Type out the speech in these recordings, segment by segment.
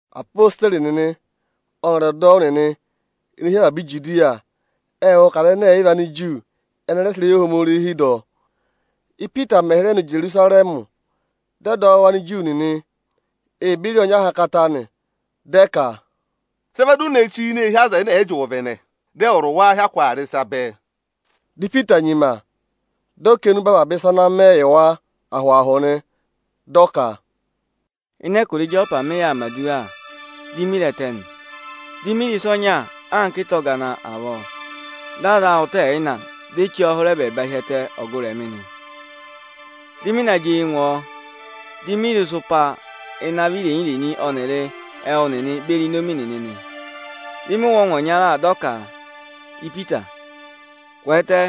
Apositeri nịnị ọnịrị ọdọwụ nịnị ene hi avaba Ijudiya ệ wụ́ ka Anigiriki ẹnị ẹ rẹ sị ịrẹyị Ohomorihi dọ. Ípita mẹ̀ hịrẹ nọ Ijerusarẹmị, dị ọdọwụ Aniju nịnị ee beri ọọ nyị ahankata nị. Dị ẹ ka, “Sị ẹ vẹ di u ne chí ini eehi aza ẹnẹ ẹ̀ yị jị ụvẹvẹnẹ, dị ẹwụrị wa hyakụ aa rị ịsa bẹẹ?” Dị Ipita nyima, dị ọ kà enube avaba ịsa ana mẹ yị wa ahụ-ahụ nị. Dị ọ ka: “Ịnị ẹkụra Ịjọpa mị yà aa mẹ̀ aduwa, di mi re ẹtẹ nị. Mê re ịsa ọnya anka ịta ọgana avọọ, dị a za a ụtọ ẹyịna, di e chí ọọ hụrẹ ẹbẹẹba hi ẹtẹ ọgụrị mị nị. Dị mị na jị eyi ngụ ọ, di mi re ịsụpa ịnị avị irenyi-irenyi ọnịrị ẹwụ nịnị beri inomi nịnị nị. Dị mị wụ́ ọngwẹ ọnya, dị ọ ka: ‘Ipita, kwẹẹtẹ,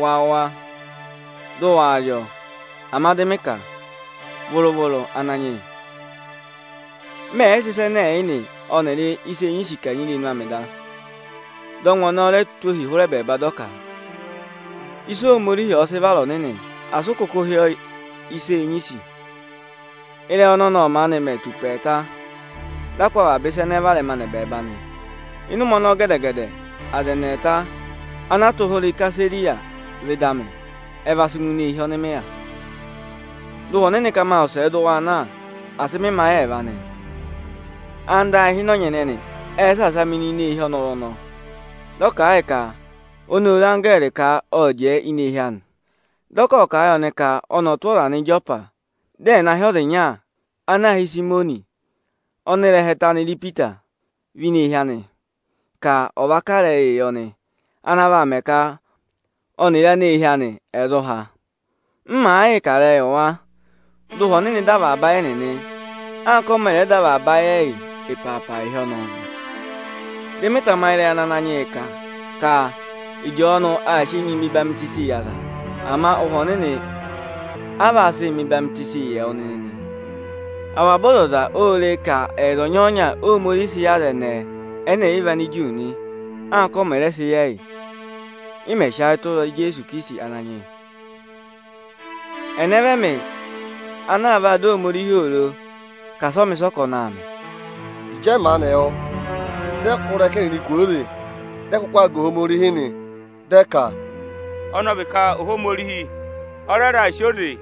wa wụ̀ wa, dị ụ waa rị ọọ!’ Ama dị mị ka: ‘Vụrụ-vụrụ, Ananyị yị, mẹ yị sị ịsa ẹnẹ ẹ̀ yị nị, ọnịrị ịsa eenyisi kanyị irenu amị da.’ Dị ọngwẹ ọnọọ re tụ́ ohi hụrẹ ẹbẹẹba dị ọ ka: ‘Ịsị Ohomorihi ọ̀ọ sị vara ọnịnị, asị ụ kụkụ hị́ ọọ ịsa eenyisi!’ Ịrẹyị ọnọnị ộ maanị mẹ tù ụpẹ ẹẹta, dị a kụ́ avaba ịsa ẹnẹẹ varẹma nọ ẹbẹẹba nị. Ịnị ụmẹ ọnọọ gẹdẹ-gẹdẹ, aza ẹnị ẹẹta ana a tụ́ hụrẹ Isesariya vẹ ịdị amị, ẹ va sị ngụ ini eehi ọnị mị yà. Dị Ụhwẹ Ọnịnị ka ma wụsẹẹ dị waa na, asị mị mẹ ayị ẹẹva nị. Anda ayị ịhịnọnyị ẹnẹnị ệ saasa mị nọ ini eehi ọnọrụ ọnọọ. Dị ọ kà a yị ka oni ô re anggẹẹrị ka ọ jẹẹ ini eehi anị. Dị ọ ka ộ kà a yị ọnị ka ọnị ọ̀ tụ́ aza nọ Ịjọpa, dị ẹ̀ na hị́ ọza ịnya ana aā hị́ Ịsayịmọnị, ọnị ịrẹha ẹtẹ anị rị Ipita, va ini eehi anị, ka ọ vaa kà ịrẹyịị yị ọnị ana vaa mẹ ka ọnịrị aneehi anị ẹ̀ zụ há. M màa yịị kà ịrẹyị yị wa, dị Ụhwẹ Ọnịnị dọ avaba ayị ẹnịnị, anka ọ mẹ̀ rẹ dọ avaba ayị ẹyị ịpaapa ịhị ọnọọ nị. Dị mị tamayị ịrẹyị ana Ananyị yị kà ka Ịjọọnụ aa sị enyi mẹ ọyịhwenyii yị aza, ama Ụhwẹ Ọnịnị a vaa sị mẹ ọyịhwenyii yị ẹwụ nịnị nị. Avaba ọzọza ô re e ka ẹyịza ọnyọọnya Óhomorihi sị yị aza ẹnẹẹ ẹnẹ ẹ̀ yị vị Aniju nị, anka ọ mẹ̀ rẹ sị yị ẹyị, ị mẹ̀ sị ayị tụra Ijeesu Ikirisiti Ananyị yị. Ẹnẹ vị ẹmị, ana vaa dọ Ohomorihi oro ka asị ọ mẹ ịsị ọ ka ọnị aa mẹ?” Ịjị ẹ maanị wụ́, dị ẹ kụ́ ịrẹka ẹnịnị kwooze, dị ẹ kụkụ aa ga Ohomorihi nị. Dị ẹ ka, “Ọnị ọ vị ka Ohomorihi ọ rẹ raà sị oze yị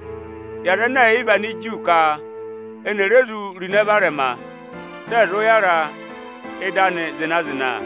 Anigiriki ka eni è re zụ ro ịnẹ varẹma, dị ẹ̀ zụ yàra ị́dị anị zịna-zịna.”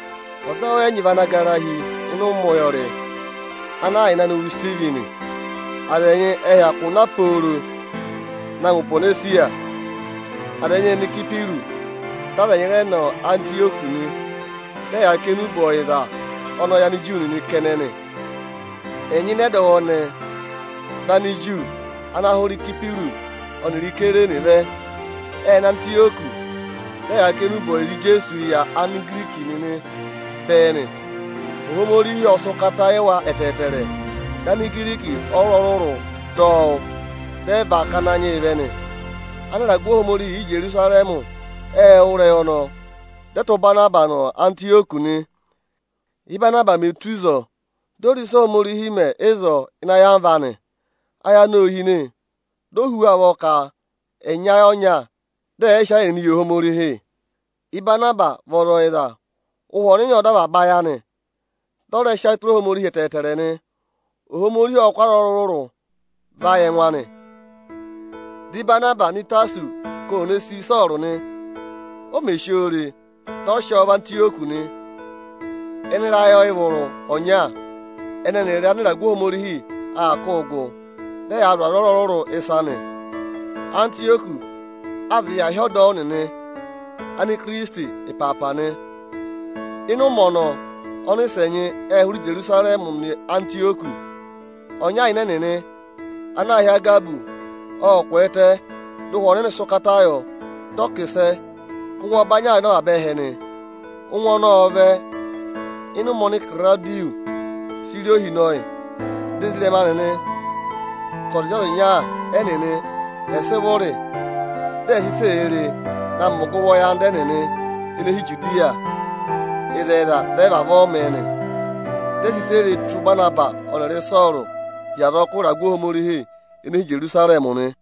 Ọdọwụ ẹnyị vị ana gara hi ịnị ụmẹ ụyọrị ana a yà ịnị anị wụ Isitivini. Aza ẹnyị ệ hyakụ na pooro na ngụ Ihwonesiya, aza ẹnyị ệ nọ Ịsayịpịrụsị, dị aza ẹnyị rẹ nọ Antịyọkị nị. Dị ẹ yaa kà enube ọyịza ọnọọ yị Aniju nịnị kẹnẹ nị. Ẹnyị ịnị ọdọwụ ẹnẹẹ vị Aniju ana hụrẹ Ịsayịpịrụsị ọnịrị Isayirini vẹ. Ệ nọ Antịyọkị, dị ẹyaa kà enube ọyịza Ijeesuu yị Anigiriki nịnị bẹẹ nị. Ohomorihi ộ sị ụkata yị wa ẹtẹẹtẹrẹ, dị Anigiriki ọrụrụ-ọrụrụ dọ wụ́, dị ẹ và ká Ananyị yị vẹ nị. Anịragụ Ohomorihi Íjerusarẹmị ệ wụ́ ịrẹyị ọnọọ, dị ẹ tụ́ Ịbanabasị nọ Antịyọkị nị. Íbanabasị mè tù ịzọọ, di o re ịsị Ohomorihi mẹ ịzọọ ịnị ayamva anị, ayị anị ô hine. Di o hú wa ụvọ ka ẹ̀ nyị ayị ọnya, dị ẹ̀ yịị sị ayị ẹnịnịị yị Ohomorihi nị. Ịbanabasị vị ọza ọyịza. Ụhwẹ Ọnịnị ộ dọ avaba ayị anị, dị ọ rẹ sị ayị tụra Ohomorihi ẹtẹẹtẹrẹ nị. Ohomorihi ộ kụ́ aza ọrụrụ-ọrụrụ va yị ẹngụ anị. Dị Ịbanabasị nọ Ịtasọsị ka oni ò ne sì Ịsọọrụ nị. O mè si oo re, dị ọ sị ọọ vẹ Antịyọkị nị. Ịnị ịrayị ọyịvụrụ ọnya, ẹnẹ ẹnịrị anịragụ Ohomorihi aa kụ́ gụ, dị ẹyaa zụ̀ aza ọrụrụ-ọrụrụ ịsa nị. Antịyọkị a vịdị yà hị́ ọdọwụ nịnị “Evere Ikirisiti” ịpaapa nị. Ịnị ụmẹ ọnọọ, ọnịsẹ ẹnyị ệ hụrẹ Ijerusarẹmị nọ Antịyọkị. Ọnya ịnị ẹnịnị ana aā hị́ Agabọsị, ộ kwẹẹtẹ, dị Ụhwẹ Ọnịnị sị ụkata yọ, dị ọ kà ịsẹ ka ụngwẹ ọbanyị aa vẹ ịnị avaba ẹhẹ nị. Ụngwẹ ọnọọ ộ vẹ ịnị ụmẹ oni Ịkịrawụdịyọsị sị rị ohinọyị. Dị ezirẹma nịnị ka ọzịnya-ọzịnya ẹnịnị ẹ̀ sị vụrị, dị ẹ̀ sị ịsị èe re na mẹ ọgụvọ yị anda ẹnịnị ene hi Ijudiya. Ịzẹyịza, dị ẹ vavọọ mẹ nị. Dị ẹ sị ịsị e re tụ́ Ịbanabasị ọnịrị Ịsọọrụ hi azọkụ ịragụ Ohomorihi ene hi Ijerusarẹmị nị.